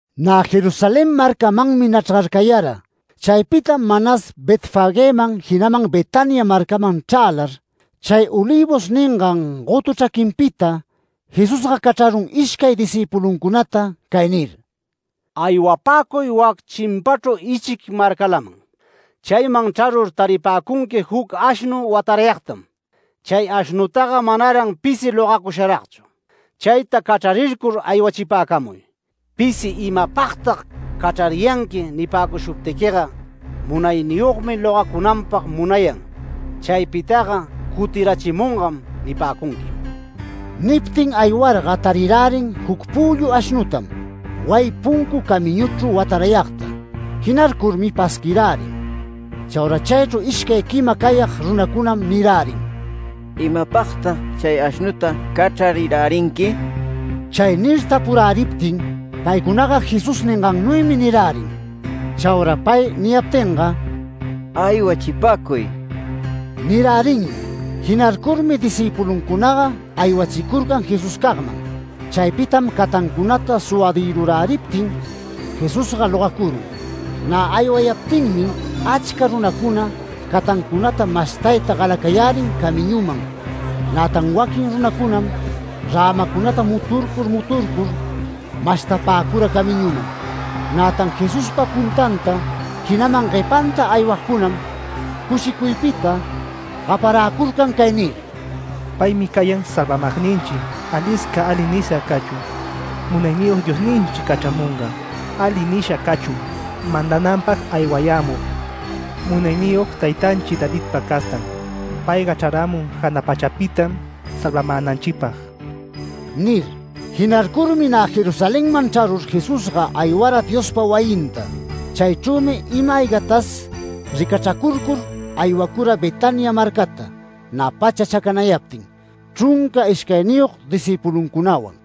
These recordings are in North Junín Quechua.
Nä Jerusalén marcamanmi nachrgarcayara. Chaypitam manas Betfagëman jinaman Betania marcaman chrälar, chay Olivos ningan gotu chraquinpita, Jesusga cachrarun ishcay discïpuluncunata, cay nir: “Aywapäcuy wac chimpachru ichic marcalaman. Chayman chrarur taripäcunqui juc ashnu watarayagtam, chay ashnutaga manaran pisi logacusharagchu. Chayta cachrarircur aywachipäcamuy. Pisi ‘¿Imapagtag cachrariyanqui?’ nipäcushuptiquiga, ‘Munayniyogmi logacunanpag munayan. Chaypitaga cutirachimungam’ nipäcunquim”. Niptin aywarga tarirärin juc püllu ashnutam wayi puncu camiñuchru watarayagta. Jinarcurmi pasquirärin. Chaura chaychru ishcay quima cayag runacunam nirärin: “¿Imapagtag chay ashnuta cachrarirärinqui?” Chay nir tapuräriptin paycunaga Jesús ningannuymi nirärin. Chaura pay niyaptinga “Aywachipäcuy” nirärinmi. Jinarcurmi discïpuluncunaga aywachicurcan Jesuscagman. Chaypitam catancunata suwadïruräriptin Jesusga logacurun. Nä aywayaptinmi achca runacuna catancunata mashtayta galacayärin camiñuman. Nätan waquin runacunam rämacunata muturcur muturcur mashtapäcura camiñuman. Nätan Jesuspa puntanta, jinaman guepanta aywagcunam, cushicuypita gaparäcurcan cay nir: “¡Paymi cayan salvamagninchi! Alisca ali nisha cachun Munayniyog Diosninchi cachramungan. Ali nisha cachun mandananpag aywayämug, munayniyog taytanchi Davidpa castan. Payga chraramun jana pachapitam salvamänanchipag” nir. Jinarcurmi nä Jerusalenman chrarur Jesusga aywara Diospa wayinta. Chaychrümi ima-aygatas ricachracurcur aywacura Betania marcata nä pacha chacanayaptin, chrunca ishcayniyog discïpuluncunawan.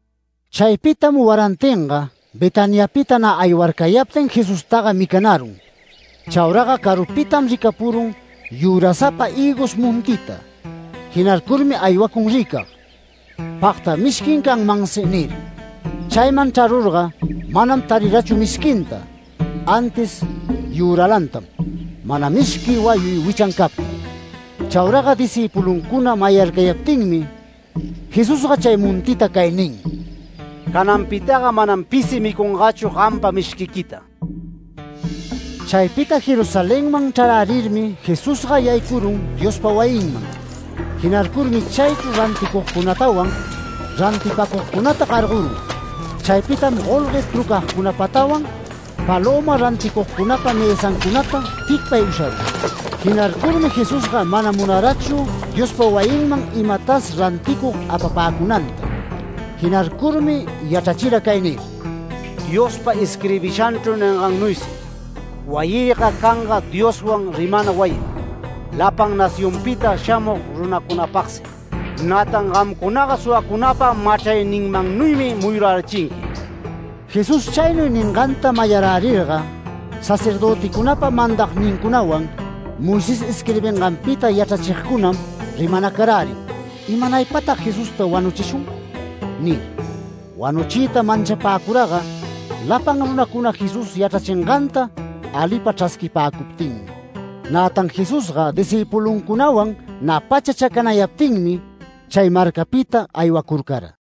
Chaypitam warantinga Betaniapita nä aywarcayaptin Jesustaga micanarun. Chauraga carupitam ricapurun yürasapa hïgos montita, jinarcurmi aywacun ricag, “Pagta mishquin canmansi” nir. Chayman chrarurga manam tarirachu mishquinta, antis yüralantam, mana mishqui wayuy wichan captin. Chauraga discïpuluncuna mayarcayaptinmi Jesusga chay montita cay nin: “Cananpitaga manam pisi micungachu gampa mishquiquita”. Chaypita Jerusalenman chrarärirmi Jesusga yaycurun Diospa wayinman. Jinarcurmi chaychru ranticugcunatawan, rantipacugcunata gargorun. Chaypitam golgue trucagcunapatawan, palöma ranticugcunapa mësancunata ticpay usharun. Jinarcurmi Jesusga mana munarachu Diospa wayinman imatas ranticug apapäcunanta. Jinarcurmi yachrachira cay nir: “Diospa isquirbishanchru ningannuysi: ‘Wayïga canga Dioswan rimana wayim, lapan nacioncunapita shamug runacunapagsi’. ¡Nätan gamcunaga suwacunapa machrayninmannuymi muyurärichinqui!” Jesús chaynuy ninganta mayarärirga sacerdöticunapa mandagnincunawan, Moisés isquirbinganpita yachrachigcunam rimanacarärin “¿Imanaypatag Jesusta wanuchishun?” nir. Wanuchiyta manchapäcuraga lapan runacuna Jesús yachrachinganta alipa chrasquipäcuptinmi. Nätan Jesusga discïpuluncunawan nä pacha chacanayaptinmi chay marcapita aywacurcara.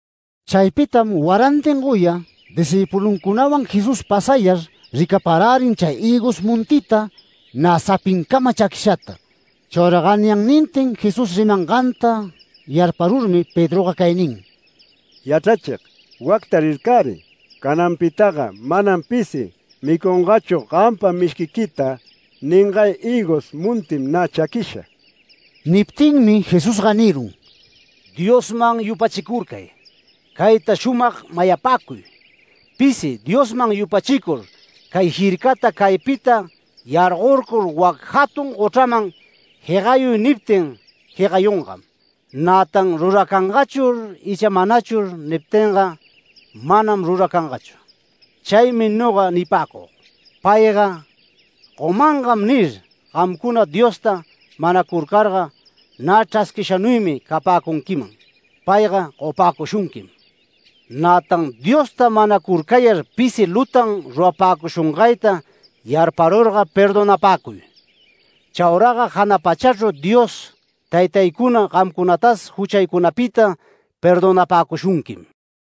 Chaypitam warantin goya discïpuluncunawan Jesús pasayar ricaparärin chay hïgos montita nä sapincama chaquishata. Chaura ganyannintin Jesús rimanganta yarparurmi Pedroga cay nin: “Yachrachig, wacta rircariy. ‘Cananpitaga manam pisi micungachu gampa mishquiquita’ ningay hïgos montim nä chaquisha”. Niptinmi Jesusga nirun: “¡Diosman yupachicurcay! Cayta shumag mayapäcuy: Pisi Diosman yupachicur, cay jircata ‘Caypita yargorcur wac jatun gochraman jegayuy’ niptin jegayungam. Nätan ‘Ruracangachur icha manachur’ niptinga manam ruracangachu. Chaymi noga nipäcug: ‘Payga gomangam’ nir gamcuna Diosta manacurcarga, nä chrasquishanuymi capäcunquiman, payga gopäcushunquim. Nätan Diosta manacurcayar, pisi lutan rurapäcushungayta yarparurga perdonapäcuy. [Chauraga jana pachachru Dios Taytaycuna gamcunatas juchaycunapita perdonapäcushunquim.]”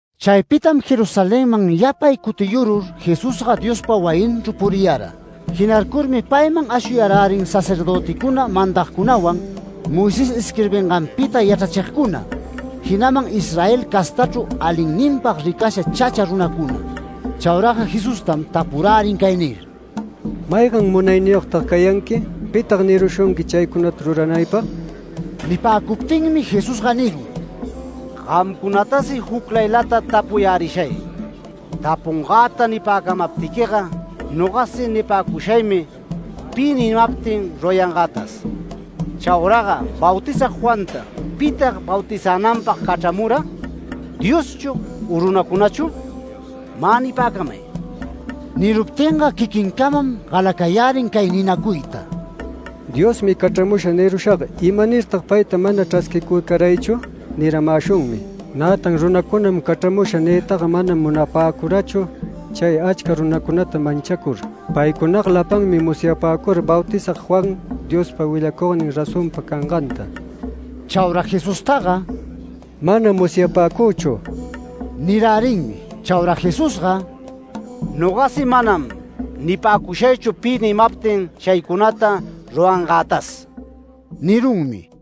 Chaypitam Jerusalenman yapay cutiyurur Jesusga Diospa wayinchru puriyara. Jinarcurmi payman ashuyarärin sacerdöticuna mandagcunawan, Moisés isquirbinganpita yachrachigcuna, jinaman Israel castachru alinninpag ricasha chacha runacuna. Chauraga Jesustam tapurärin cay nir: “¿Maygan munayniyogtag cayanqui? ¿Pitag nirushunqui chaycunata ruranaypag?” Nipäcuptinmi Jesusga nirun: “Gamcunatasi juclaylata tapuyärishay. Tapungäta nipäcamaptiquiga, nogasi nipäcushaymi, pi nimaptin rurayangätas. Chauraga Bautizag Juanta, ¿pitag bautizänanpag cachramura, Dioschu u runacunachu? Mä nipäcamay”. Niruptinga quiquincamam galacayärin cay ninacuyta: “ ‘Diosmi cachramusha’ nirushaga ‘¿Imanirtag payta mana chrasquicurcaraychu?’ niramäshunmi. Nätan ‘Runacunam cachramusha’ niytaga manam munapäcurachu, chay achca runacunata manchacur. Paycunaga lapanmi musyapäcura Bautizag Juan Diospa willacugnin razonpa canganta”. Chaura Jesustaga “Manam musyapäcüchu” nirärinmi. Chaura Jesusga “Nogasi manam nipäcushaychu pi nimaptin chaycunata rurangätas” nirunmi.